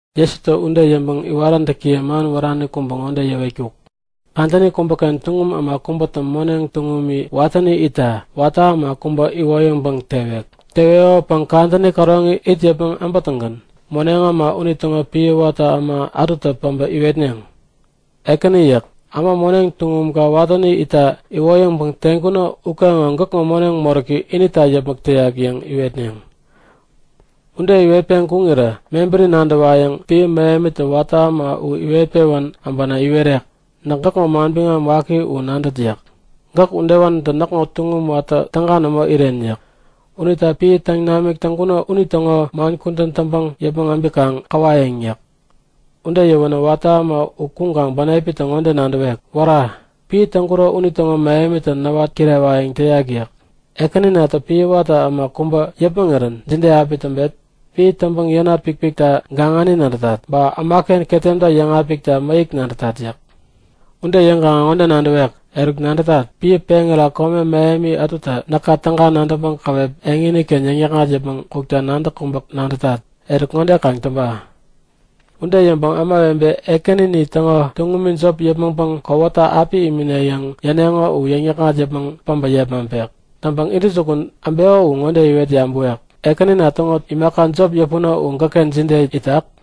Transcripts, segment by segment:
Jesutä ude yäŋpäŋ iwaräntäkiye man wärani kubä ŋode yäwetkuk; Kadäni kubäken tuŋum äma kubätä moneŋ tuŋumi watäni itta watä äma kubä iwoyäŋpäŋ tewek. Teweko kadäni käroŋi it yäpmäŋ äbätäŋgän moneŋ äma unitäŋo piä watä äma ätutä päbä iwetneŋ; Ekäni yäk. Äma moneŋ tuŋumka watäni itta iwoyäŋpäŋ teŋkuno ukeŋo gäkŋo moneŋ moräki inita yäpmäk täyak yäŋ iwetneŋ. Ude iwetpeŋ kuŋirä mebäri nadäwayäŋ piä mähemitä watä äma u iwet-pewän äbänä iwerek; Näk gäkŋo manbiŋam waki u nadät yäk. Gäk udewanitä näkŋo tuŋum watä täga nämo iren yäk. Unita piä täŋ namik täŋkuno unitäŋo man kudän täŋpäŋ yäpmäŋ äbikaŋ käwayäŋ yäk. Ude yäwänä watä äma u kuŋkaŋ bänepitä ŋode nadäwek; Wära! Piä täŋkuro unitäŋo mähemitä näwat kirewayäŋ täyak yäk. Ekäninatä piä watä äma kubä yäpmäŋirän jide api täŋpet? Piä täŋpäŋ yänat pikpikta gaŋani nadätat. Ba ämaken ketemta yäŋapikta mäyäk nadätat yäk. Ude yäŋkaŋä ŋode nadäwek; Eruk, nadätat! Piä peŋira kome mähem ätutä näka täga nadäŋpäŋ käwep eŋini-ken yäŋnäkŋat yäpmäŋ kukta nadäk kubä nadätat. Eruk ŋode kaŋ täŋpa! Ude yäŋpäŋ ämawebe ekänini täŋo tuŋum jop yäpmäŋpäŋ kowata api imine yäŋ yäneŋo u yäŋ-yäkŋat yäpmäŋ päbä yepmaŋpek. Täŋpäŋ intäjukun äbeko u ŋode iwet yabäwek; Ekänina täŋo imaka jop yäpuno u gäkken jide itak?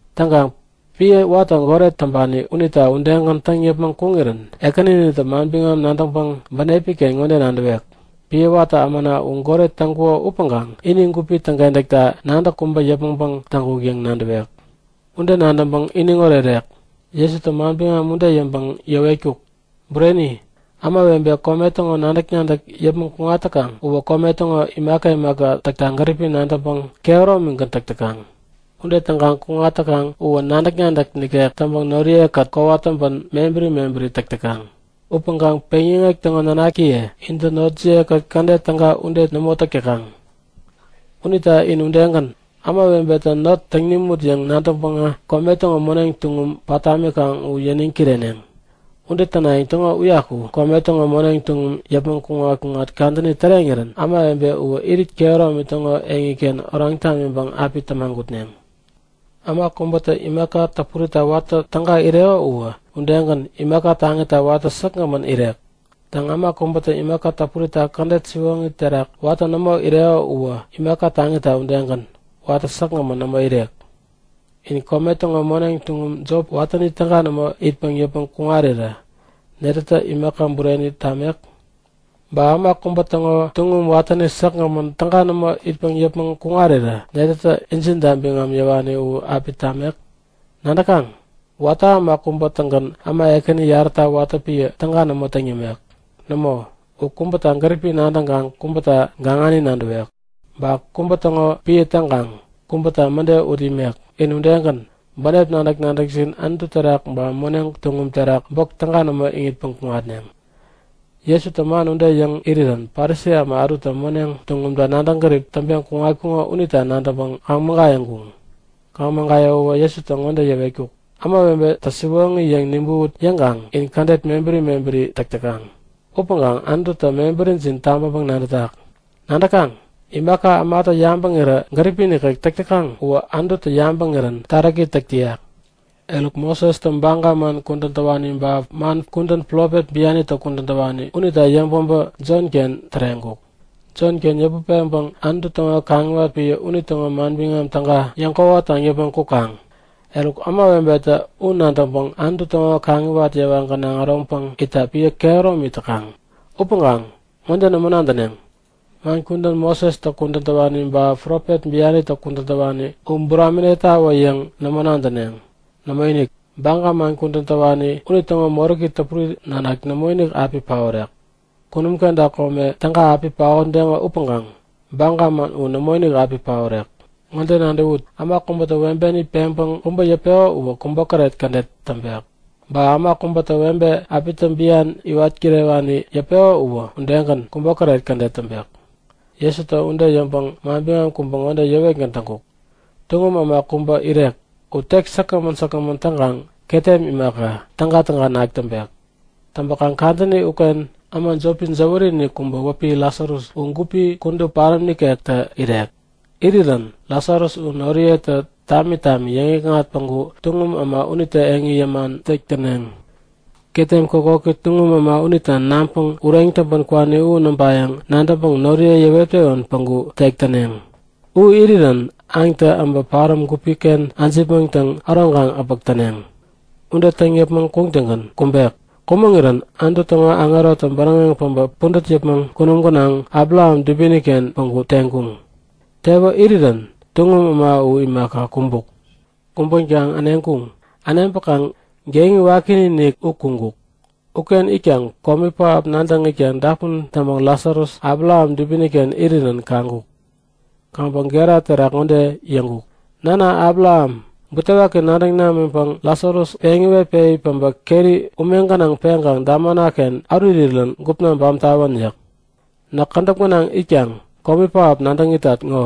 Täŋkaŋ piä watä goret täŋpani unitä udegän täŋ yäpmäŋ kuŋirän ekäninitä manbiŋam nadäŋpäŋ bänepi-ken ŋode nadäwek; Piä watä ämana u goret täŋkuko upäŋkaŋ ini gupi täŋkentäkta nadäk kubä yäpmäŋpäŋ täŋkuk yäŋ nadäwek. Ude nadäŋpäŋ iniŋ orerek. Jesutä manbiŋam ude yäŋpäŋ yäwetkuk; Bureni! Ämawebe kome täŋo nadäk-nadäk yäpmäŋ kuŋat täkaŋ uwä kome täŋo imaka imaka täkta gäripi nadäŋpäŋ kehäromigän täk täkaŋ. Ude täŋkaŋ kuŋat täkaŋ uwä nadäk-nadäk nikek täŋpäŋ noriye-kät kowat täŋpän mebäri mebäri täk täkaŋ. Upäŋkaŋ peŋyäŋek täŋo nanakiye intä notjiye-kät kädet täga ude nämo täk täkaŋ. Unita in udegän, ämawebetä not täŋ nimut yäŋ nadäŋpäŋä kome täŋo moneŋ tuŋum pat tamikaŋ u yäniŋ kireneŋ. Ude tänayäŋ täŋo uyaku kome täŋo moneŋ tuŋum yäpmäŋ kuŋat-kuŋat kadäni täreŋirän ämawebe uwä irit kehäromi täŋo eŋiken oraŋ tamiŋpäŋ api tämagutneŋ. Äma kubätä imaka täpurita watä täga ireko uwä, udegän imaka taŋita watä säkgämän irek. Täŋ, äma kubätä imaka täpurita kädet siwoŋi terak watä nämo ireko uwä imaka taŋita udegän watä säkgämän nämo irek. In kome täŋo moneŋ tuŋum jopi watäni täga nämo itpäŋ yäpmäŋ kuŋarirä netätä imaka bureni tamek? Ba äma kubä täŋo tuŋum watäni säkgämän täga nämo itpäŋ yäpmäŋ kuŋarirä netätä injinta biŋam yäwani u api tamek? Nadäkaŋ? Watä äma kubä-tägän äma ekäni yaräta watä piä täga nämo täŋ yämek. Nämo, u kubäta gäripi nadäŋkaŋ kubäta gaŋani nadäwek. Ba kubä täŋo piä täŋkaŋ kubäta mäde ut imek. In udegän, bänep nadäk-nadäkjin Anutu terak ba moneŋ tuŋum terak bok täga nämo iŋitpäŋ kuŋatneŋ. Jesutä man ude yäŋ irirän Parisi äma ätu moneŋ tuŋumta nadäŋ gärip täŋpeŋ kuŋatkuŋo unitä nadäŋpäŋ kaŋ-mägayäŋkuŋ. Kaŋ-mägayäwäwä Jesutä ŋode yäwetkuk; Ämawebetä siwoŋi yäŋ nibäwut yäŋkaŋ in kädet mebäri mebäri täk täkaŋ. Upäŋkaŋ Anututä mebärijin tabäŋpäŋ-nadätak. Nadäkaŋ? Imaka ämatä yabäŋirä gäripi nikek täk täkaŋ uwä Anututä yabäŋirän taräki täk täyak. Eruk Mosestä baga man kudän täwani ba man kudän profet bianitä kudän täwani unitä yäŋpäbä Jonken täreŋkuk. Jon-ken yäput peŋpäŋ Anutu täŋo kaŋiwat piä unitäŋo Manbiŋam Täga yäŋ-kwawataŋ yäpmäŋ kukaŋ. Eruk ämawebetä u nadäŋpäŋ Anutu täŋo kaŋiwat yewa gänaŋ äroŋpäŋ itta piä kehäromi täkaŋ. Upäŋkaŋ ŋode nämo nadäneŋ; Man kudän Mosestä kudän täwani ba Profet bianitä kudän täwani u buraminektawä yäŋ nämo nadäneŋ. Nämoinik! Baga man kudän täwani unitäŋo moräki täpuri nanak nämoinik api paorek. Kunum kenta kome täga api paotdeŋo upäŋkaŋ Baga man u nämoinik api paorek. Ŋode nadäwut; Äma kubätä webeni peŋpäŋ kubä yäpeko uwä kubokäret kädet täŋpek. Ba äma kubätä webe, äpitä bian iwat kirewani yäpeko uwä, udegän kubokäret kädet täŋpek. Jesutä ude yäŋpäŋ manbiŋam kubä ŋode yäwetgän täŋkuk; Tuŋum äma kubä irek. U tek säkgämän säkgämän täŋkaŋ ketem imaka, tägatäga nak täŋpek. Täŋpäkaŋ kadäni uken, äma jopi jäwäri-inik kubä wäpi Lasarus u gupi kudup paräm nikektä irek. Irirän Lasarus u noriyetä tami tami yäŋikŋat päŋku tuŋum äma unitä eŋi yäman tek täŋpek. Ketem kokoki tuŋum äma unitä naŋpäŋ ureŋ täŋpän kwani u näŋpayäŋ nadäŋpäŋ noriye yäwet-pewän päŋku tek täŋpek. U irirän aŋtä äbä paräm gupi-ken äjipmäŋtäŋ äroŋkaŋ äpäk täneŋ. Ude täŋ yäpmäŋ kuŋtäŋgän kumbuk. Kumäŋirän Anutu täŋo aŋerotä bäräŋeŋ äbä pudät yäpmäŋ kunum gänaŋ Abraham dubini-ken päŋku teŋkuŋ. Tewä irirän tuŋum äma u imaka, kumbuk. Kumbänkaŋ äneŋkuŋ. Äneŋpäkaŋ geŋi wakiinik u kuŋkuk. Uken itkaŋ komi pähap nadäŋ itkaŋ dapun täŋpäŋ Lasarus Abraham dubini-ken irirän kaŋkuk. Kaŋpäŋ gera terak ŋode yäŋkuk; Nana Abraham, butewaki nadäŋ namiŋpäŋ Lasarus peŋ iwetpewi äpä keri ume gänaŋ peŋkaŋ damana-ken ärurirän gupna bam tawän yäk. Näk kädäp gänaŋ itkaŋ komi pähap nadäŋ itat ŋo!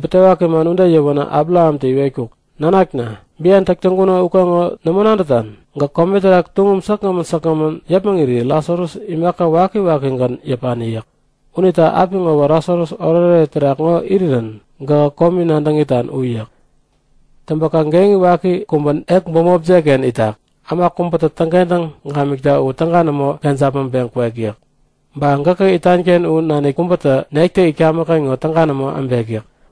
Butewaki man ude yäwänä Abrahamtä iwetkuk; Nanakna, bian täk täŋkuno ukeŋo nämo nadätan? Gäk kome terak tuŋum säkgämän säkgämän yäpmäŋiri Lasarus imaka wakiwakigän yäpani yäk. Unita apiŋowä Lasarus oretoret terak ŋo irirän gähä komi nadäŋ itan u yäk. Täŋpäkaŋ geŋi waki kubä ek bämopjek-ken itak. Äma kubätä täŋkentäŋ gamikta u täga nämo kejapmäŋpeŋ kwek yäk. Ba gäkä itan-ken u nanik kubätä nektä itkamäk-ken ŋo täga nämo äbek yäk.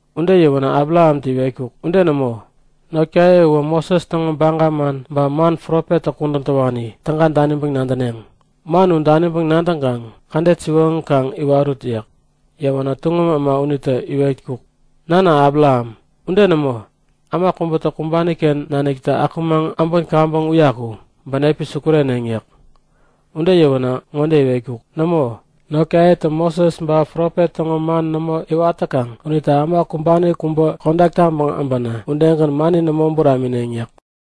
Ude yäwänä Abrahamtä iwetkuk; Ude nämo. Notkaye uwä Moses täŋo baga man ba man profettä kudän täwani täga daniŋpäŋ nadäneŋ. Man u daniŋpäŋ nadäŋkaŋ kädet siwoŋi kaŋ iwarut yäk. Yäwänä tuŋum äma unitä iwetkuk; Nana Abraham, ude nämo! Äma kubätä kumbani-ken naniktä akumaŋ äbän kaŋpäŋ uyaku bänepi sukureneŋ yäk. Ude yäwänä ŋode iwetkuk; Nämo. Notkayetä Moses ba profet täŋo man nämo iwat täkaŋ unita äma kumbani kubä kodak taŋpäŋ äbänä udegän mani nämo buramineŋ yäk.